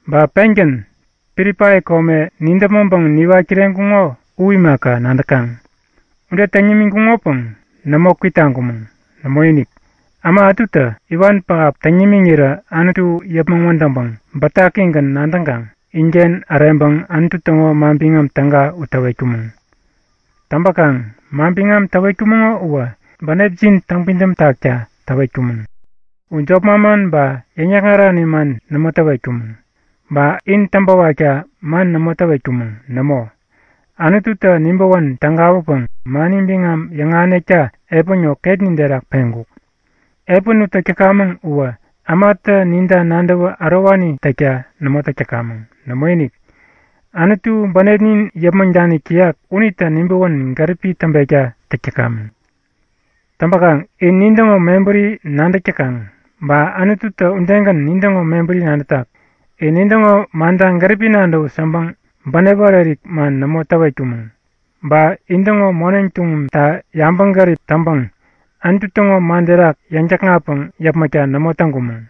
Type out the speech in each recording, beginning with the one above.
Ba pengän Pilipai kome nidäpmäŋpäŋ niwat kireŋkuŋo u imaka, nadäkaŋ. Ude täŋ nimiŋkuŋopäŋ nämo kwitaŋkumäŋ. Nämoinik. Äma ätutä iwan pähap täŋ nimiŋirä Anutu yäpmäŋ wädäŋpäŋ bätakigän nadäŋkaŋ inken äreŋpäŋ Anutu täŋo Manbiŋam Täga u täwetkumäŋ. Täŋpäkaŋ manbiŋam täwetkumäŋo uwä bänepjin täŋpidäm takta täwetkumäŋ. U jop manman ba yäŋ-täkŋarani man nämo täwetkumäŋ. Ba in täŋpäwakta man nämo täwetkumäŋ. Nämo, Anututä nibäwän tägawäpäŋ mani biŋam yäŋahänekta epän ŋo ketnin terak peŋkuk. Epän u täk täkamäŋ uwä ämatä ninta nadäwä ärowani täkta nämo täk täkamäŋ. Nämoinik, Anutu bänepnin yäpmäŋ danik täyak unitä nibäwän gäripi täŋpekta täk täkamäŋ. Täŋpäkaŋ in nintäŋo mebäri nadäk täkaŋ, ba Anututä udegän nintäŋo mebäri nadätak. In nintäŋo manta gäripi nadäwut yäŋpäŋ bänep ärik-ärik man nämo täwetkumäŋ ba intäŋo moneŋ tuŋumta yabäŋgärip täŋpäŋ Anutu täŋo man terak yäŋ-täkŋatpäŋ yäpmäkta nämo täŋkumäŋ.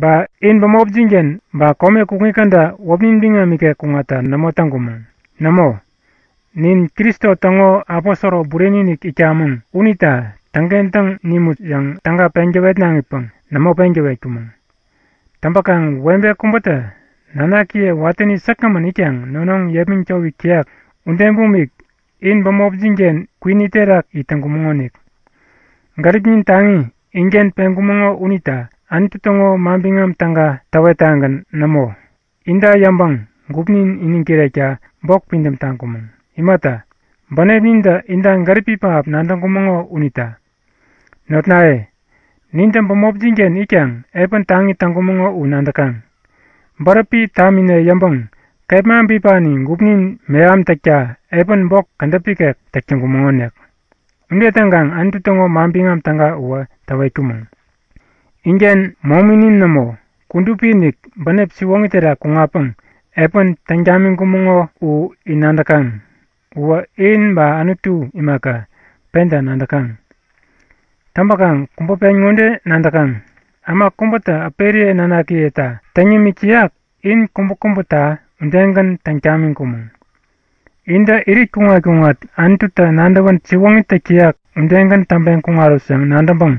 Ba in bämopjin-ken ba kome kukŋi käda wäpnin biŋam ikek kuŋatta nämo täŋkumäŋ. Nämo, nin Kristo täŋo aposoro bureni-inik itkamäŋ unita täŋkentäŋ nimut yäŋ täga peŋ täwetnaŋipäŋ nämo peŋ täwetkumäŋ. Täŋpäkaŋ webe kubätä nanakiye watäni säkgämän itkaŋ nonoŋ yepmäŋ towik täyak ude bumik in bämopjin-ken kwini terak it täŋkumäŋonik. Gäripnin taŋi inken peŋkumäŋo unita Anutu täŋo Manbiŋam Täga täwettagän nämo. Inta yäŋpäŋ gupnin iniŋ kirekta bok pidäm taŋkumäŋ. Imata, bänepnintä inta gäripi pähap nadäŋkumäŋo unita. Notnaye, nintä bämopjin-ken itkaŋ epän taŋi täŋkumäŋo u nadäkaŋ. Bäräpi tamine yäŋpäŋ kepma bipani gupnin mehamtäkta epän bok kädäp ikek täk täŋkumäŋonik. Ude täŋkaŋ Anutu täŋo Manbiŋam Täga uwä täwetkumäŋ. Inken mominin nämo, kudupi-inik, bänep siwoŋi terak kuŋatpäŋ epän täŋ tamiŋkumäŋo u in nadäkaŋ. Uwä in ba Anutu imaka, penta nadäkaŋ. Täŋpäkaŋ kubä pen ŋode nadäkaŋ; Äma kubätä äperiye nanakiyeta täŋ yämik täyak, in kubäkubäta udegän täŋ tamiŋkumäŋ. Intä irit kuŋat-kuŋat Anututä nadäwän siwoŋi täk täyak udegän täŋpeŋ kuŋarut yäŋ nadäŋpäŋ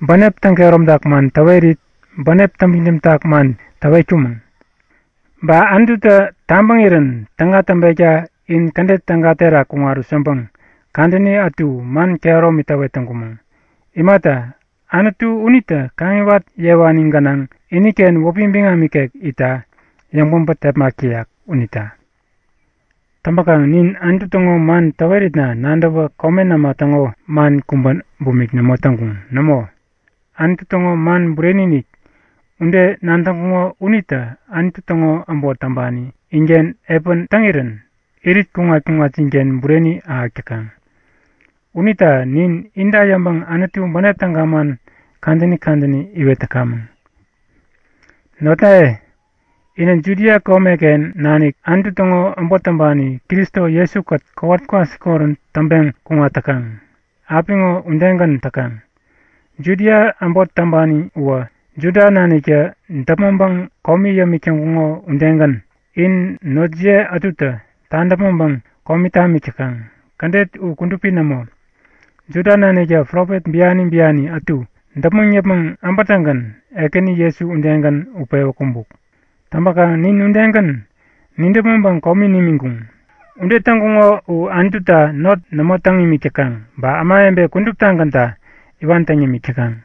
bänep täŋ-kehäromtak man täwerit, bänep täŋpidäm tak man täwet täŋkumäŋ. Ba Anututä tabäŋirän täga täŋpekta in kädet täga terak kuŋarut yäŋpäŋ kadäni ätu man kehäromi täwetkumäŋ. Imata, Anutu unitä kaŋiwat yewani gänaŋ, iniken wäpi biŋam ikek itta yäŋpäbä tepmak täyak unita. Täŋpäkaŋ nin Anutu täŋo man täweritna nadäwä komen äma täŋo man kubä bumik nämo täŋkuŋ. Nämoinik! Anutu täŋo man bureni-inik ude nadäŋkuŋo unitä Anutu täŋo äbot täŋpani inken epän täŋirän irit kuŋat-kuŋatjinken bureni ahäk täkaŋ. Unita nin inta yäŋpäŋ Anutu bänep täga man kadäni kadäni iwet täkamäŋ. Notnaye, inä Judia komeken nanik Anutu täŋo äbot täŋpani Kristo Jesu-kät kowat kwasikorän täŋpeŋ kuŋat täkaŋ, apiŋo udegän täkaŋ. Judia äbot täŋpani uwä Juda naniktä däpmäŋpäŋ komi yämik täŋkuŋo udegän in notjiye ätutä tadäpmäŋpäŋ komi tamik täkaŋ. Kädet u kudupi nämo. Juda naniktä profet biani biani ätu däpmäŋ yäpmäŋ äbätäŋgän Ekäni Jesu udegän utpewä kumbuk. Täŋpäkaŋ nin udegän nidäpmäŋpäŋ komi nimiŋkuŋ. Ude täŋkuŋo u Anututa not nämo täŋ imik täkaŋ ba ämawebe kuduptagänta iwan täŋ yämik täkaŋ.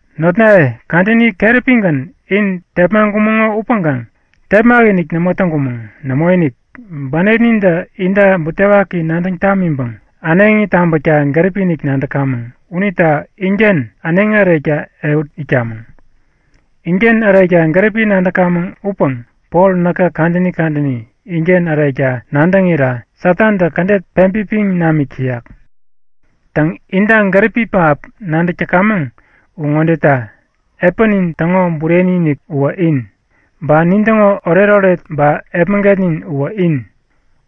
Notnaye, kadäni keräpigän in tepmaŋkumäŋo upäŋkaŋ tepmak-inik nämo täŋkumäŋ. Nämoinik. Bänepnintä inta butewaki nadäŋ tamiŋpäŋ äneŋi tabäkta gäripi-inik nadäkamäŋ unita inken äneŋi ärekta ehut itkamäŋ. Inken ärekta gäripi nadäkamäŋ upäŋ Pol näkä kadäni kadäni inken ärekta nadäŋira Satantä kädet peŋpipiŋ namik täyak. Täŋ, inta gäripi pähap nadäk täkamäŋ u ŋodeta; Epänin täŋo bureni-inik uwä in, ba nintäŋo oretoret ba epmägetnin uwä in,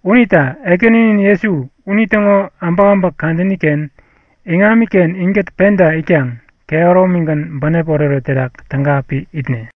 unita Ekäninin Jesu unitäŋo äbäkäbäk kadäni-ken iŋamiken inkät penta itkaŋ kehäromigän bänep oretoret terak täga api itne.